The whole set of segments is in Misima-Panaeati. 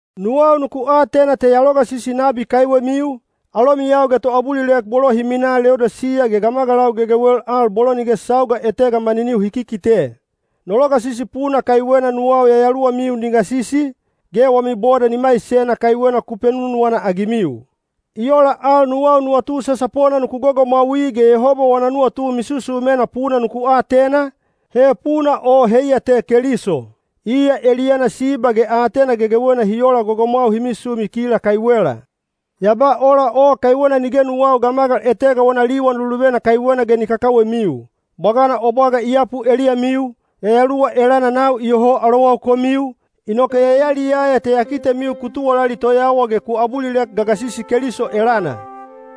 Nuwau nuku atena te ya logasisi nabi kaiwemiu, alomiyau ge toabulilek bolo hi minaa Leodisiya ge gamagalau gegewel al bolo nige sauga etega maniniu hi kikite. No logasisi puna kaiwena nuwau yayaluwamiu ni gasisi, ge wami boda ni maisena kaiwena ku penunuwana-agimiu. I ola al nuwau nuwatu sasapona nuku gogomwaui ge Yehoba wana nuwatu misusumena puna nuku atena, he puna o heiya te Keliso. Iya eliyana siba ge aatena gegewena hi ola gogomwau hi misumi kila kaiwela. Ya ba ola o kaiwena nige nuwau gamagal etega wana liwan luluvena kaiwena ge ni kakawemiu. Bwagana o bwaga i yapu eliyamiu, yayaluwa elana nau iyoho alowau komiu, inoke ya yaliyaya te ya kitemiu ku tuwalali toyawa ge ku abulilek gagasisi Keliso elana.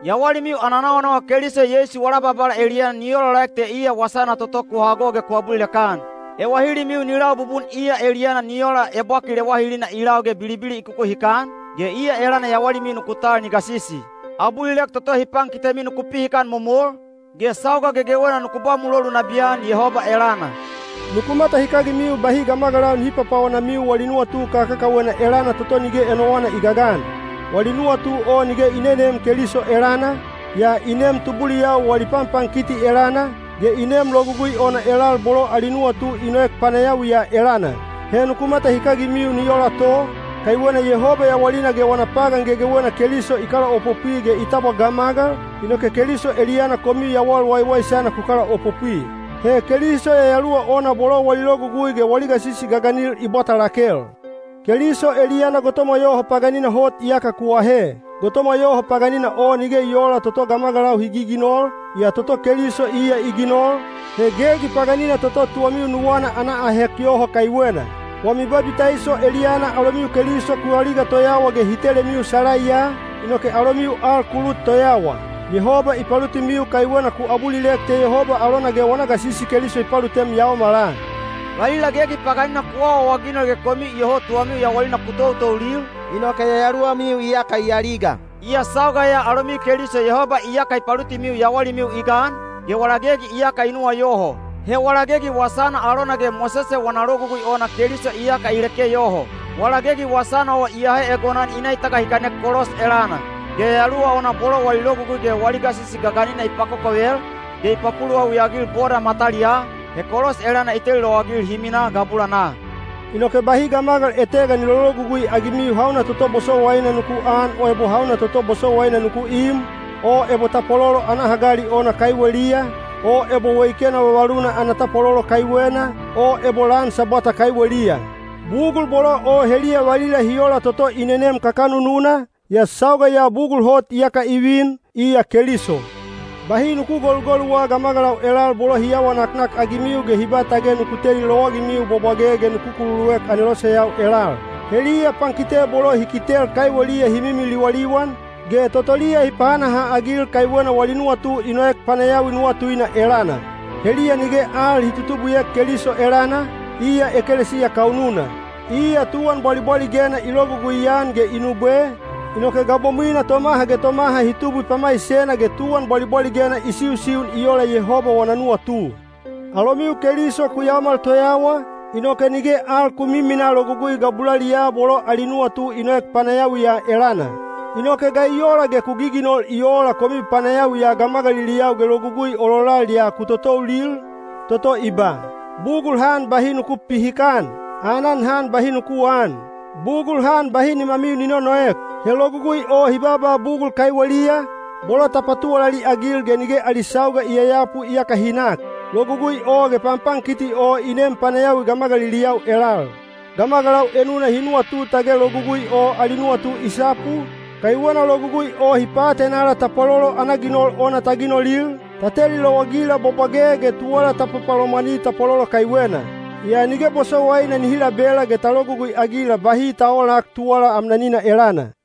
Yawalimiu ana nawanawa Keliso Yeisu wala Babala eliyana ni olaolaek te iya wasana toto ku hago ge ku abulilek-an. Ewahilimiu ni lau bubun iya eliyana ni ola ebwakil ewahilina i lau ge bilibili i kukuhikan, ge iya elana yawalimiu nuku tal ni gasisi. Abulilek toto hi pankitemiu nuku pihikan momol, ge sauga gegewena nuku ba mulolu nabiyan Yehoba elana. Nuku matahikagimiu bahi gamagalau nihi papaonamiu wali nuwatu kakakawena elana toto nige enowana i gagan. Wali nuwatu o nige i neneem Keliso elana, yaa i neem tubuliyau wali panpankiti elana, ge i neem logugui ona elal bolo ali nuwatu i noek panayawi ya elana. He nuku matahikagimiu ni ola to, kaiwena Yehoba yawalina ge wana pagan gegewena Keliso i kalaopopwi ge i tabwa gamagal, inoke Keliso eliyana komiu yawal waiwaisana ku kalaopopwi. He Keliso yayaluwa ona bolo wali logugui ge wali gasisi gaganil i bwata lakel. Keliso eliyana gotomwa yoho paganina hot iyaka ku ahe. Gotomwa yoho paganina o nige i oola toto gamagalau hi giginol, yaa toto Keliso iya i ginol, he gegi paganina toto tuwamiu nuwana ana ahek yoho kaiwena. Wami babitaiso eliyana alomiu Keliso ku aliga toyawa ge hi telemiu salaiya, inoke alomiu al ku lut toyawa. Yehoba i palutimiu kaiwena ku abulilek te Yehoba alona ge wana gasisi Keliso i palutem yaomala. Valila gegi paganina ku awaawaginol ge komiu iyoho tuwamiu yawalina ku toutoulil, inoke yayaluwamiu iyaka i aliga. Yaa sauga ya alomiu Keliso Yehoba iyaka i palutimiu yawalimiu i gan, ge wala gegi iyaka i nuwayoho. He wala gegi wasana alona ge Mosese wana Logugui ona Keliso iyaka i leke yoho. Wala gegi wasana o i ahe egonan i na i tagahikanek kolos elana. Ge yayaluwa ona bolo wali logugui ge wali gasisi gaganina i pakokovel, ge i papuluwawi-agil boda mataliyaa, he kolos elana i teli lowagil hi minaa gabulanaa. Inoke bahi gamagal etega ni lologugui-agimiu hauna toto bosowaina nuku an o ebo hauna toto bosowaina nuku im, o ebo tapwalolo ana hagali ona kaiweliya, o ebo weikena vavaluna ana tapwalolo kaiwena, o ebo lan Sabwata kaiweliya. Bugul bolo o heliya valila hi ola toto i nenem kakanununa, yaa sauga ya bugul hot iyaka i vin, iya Keliso. Bahi nuku golugoluwa gamagalau elal bolo hi awa naknakagimiu ge hi ba tage nuku teli lowagimiu bwabwage ge nuku kululuek aneloseyau elal. Heliya pankite bolo hi kitel kaiweliya hi mimi liwaliwan, ge totoliya hi pahanaha-agil kaiwena wali nuwatu i noek panayawi nuwatuina elana. Heliya nige al hi tutubwiek Keliso elana, iya ekelesiya kaununa. Iya tuwan bwalibwaligena i logugui-an ge i nubwe, inoke gabomwina tomaha ge tomaha hi tubwi pamaisena ge tuwan bwalibwaligena i siusiun i ola Yehoba wana nuwatu. Alomiu Keliso ku yaomal toyawa, inoke nige al ku miminaa logugui gabulaliyaa bolo ali nuwatu i noek panayawi ya elana. Inoke ga i ola ge ku giginol i oola komiu panayawi ya gamagaliliyau ge logugui ololal ya ku toutoulil, toto i ba: Bugul han bahi nuku pipihikan! Aanan han bahi nuku aan! Bugul han bahi nimamiu ni nonoek! He logugui o hi baaba bugul kaiweliya, bolo ta patuwalali-agil ge nige ali sauga i yayapu iyaka hi nak. Logugui o ge panpankiti o i neem panayawi gamagaliliyau elal. Gamagalau enuna hi nuwatu tage logugui o ali nuwatu i sapu, kaiwena logugui o hi paatenala tapwalolo ana ginol ona ta ginolil, ta teli lowagila bwabwage ge tuwala ta papalomwani tapwalolo kaiwena. Yaa nige bosowaina nihi labela ge ta logugui-agila bahi ta oolak tuwala amnanina elana.